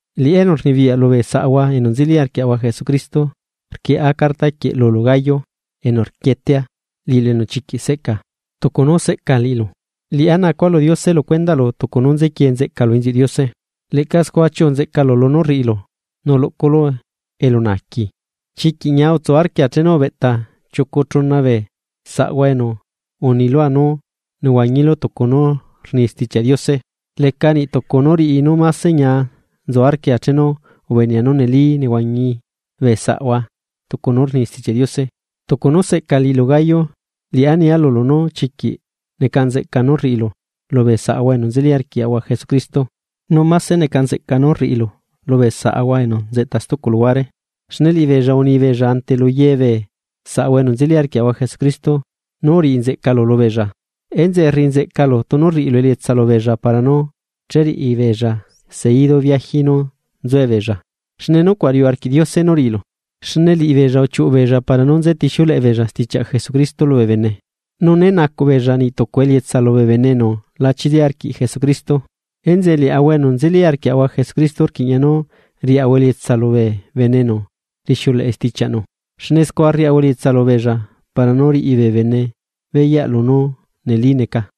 Liꞌá enu rnibiyaꞌ lubee saꞌahua enu nzeli arquiaꞌahua Jesucristo, rquieꞌa carta quieꞌ lulu Gayo enu rquietea, liꞌilu enu chiquiꞌ seꞌca. Tucu nu seꞌca liꞌilu, scua rnacua lu Diose lu cuendaꞌlu nu tucu nú nzequiee nzeꞌcalu inziuꞌ Diose, leꞌca scua chiuꞌu nzeꞌcalu lunú rriꞌilu nu luꞌculu elunaaqui. Chiquiꞌ ñia utsu arquia chenu ubeꞌta chiucu chuna bee saꞌahua enu uni lua nú nehuañilu tucu nú rni Stichiaꞌ Diose. Leca niꞌ tucu nú riꞌi nu máse ñia nzu arquia chenu ubenea nu neli nehuañi bee saꞌahua tucu nú rni Stichiaꞌ Diose. Tucu nú seꞌca liꞌilu Gayo, liꞌá nia lulu nú chiquiꞌ neca nzeꞌca nú rriꞌilu lubee saꞌahua enu nzeli arquiaꞌahua Jesucristo, nu máse neca nzeꞌca nu rriꞌilu lubee saꞌahua enu nzeꞌta stucu luhuare. Xne liꞌibeella uni beella ante lu ye bee saꞌahua enu nzeli arquiaꞌahua Jesucristo nu uriꞌi nzeꞌcalu lubeella. Enzeꞌe rriꞌi nzeꞌcalu tunu rriꞌilu elietsa lubeella para nu cheriꞌi beella seidu viaji nú nzuebeella, xne nucuaꞌ riuꞌ arquiꞌ Diose nú riꞌilu. Xne liꞌibeella uchiuꞌu beella para nú nzetixiuleꞌe beella stichiaꞌ Jesucristo lubee bene, nu né nacuꞌ beella niꞌ tucu elietsa lubee bene enu la chili arquiꞌ Jesucristo. Enzeꞌe liaꞌahua enu nzeli arquiaꞌahua Jesucristo rquiꞌña nú riaꞌahua elietsa lubee bene enu rixuleꞌe stichiaꞌnu, xne scua rriaꞌahua elietsa lubeella para nú riꞌi bee bene beyaꞌ lunú neli neca.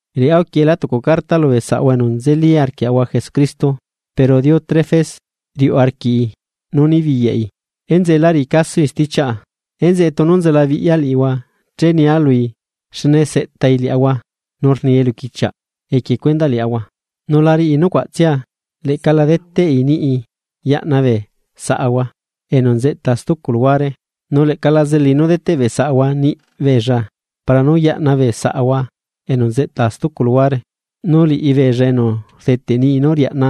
Liꞌá uquieꞌela tucu carta lubee saꞌahua enu nzeli arquiaꞌahua Jesucristo, pero Diótrefes riuꞌ arquiꞌi nú nibiyaꞌi, enzeꞌe la riꞌi casoi stichiaꞌa. Enzeꞌe, tunu nzelabiꞌya liꞌihua, che nia lui xne seꞌtai liaꞌahua nu rni eluquichiaꞌ equie cuendaꞌ liaꞌahua. Nu la riꞌi nucuaꞌtsia, leꞌca la deteꞌi niꞌi yaꞌna bee saꞌahua enu nzeꞌta stucu luhuare, nu leꞌca la zelai nú deteꞌ bee saꞌahua niꞌi beella para nú yaꞌna bee saꞌahua enu nzeꞌta stucu luhuare, nu liꞌibeella enu rdeteꞌ niꞌi nú riaꞌna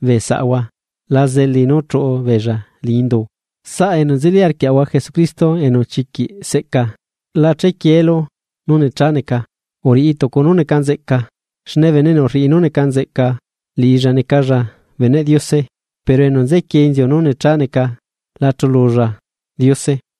bee saꞌahua la zelai nu chuꞌu beella liñi indu. Saꞌa enu nzeli arquiaꞌa Jesucristo enu chiquiꞌ seꞌca, la chequieelu nu necha neca, uriꞌi tucu nu neca nzeꞌca. Xne bene enu rriꞌi nu neca nzeꞌca liꞌilla necalla beneꞌ Diose, pero bene enu nzequie inziu nu necha neca la chululla Diose.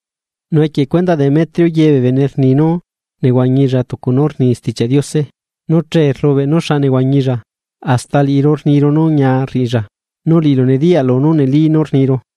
Nu equie cuendaꞌ Demetrio ye bee bene rni nu nehuañilla tucu nu rni Stichiaꞌ Diose, nu chee rlubeꞌ nu xa nehuañilla. Hasta liꞌiru rniru nú ñia rriꞌilla, nu liꞌilu nediyaꞌlu nu neli nú rniru.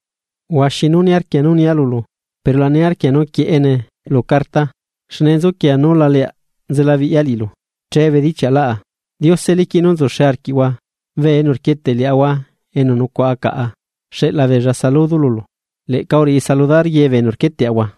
Huaxi nu niarquia nú nia lulu, pero la niarquia nu quieꞌene lu carta. Xne nzuquia nú la leaꞌ nzelabiꞌya liꞌilu, che bedichiaꞌlaꞌa. Diose liquiꞌ nú nzuxe arquiꞌhua. Bee enu rquieteꞌ liaꞌahua enu nucuaꞌa caꞌa xeꞌla beella saludo lulu, leꞌca uriꞌi saludar ye bee enu rquieteꞌahua.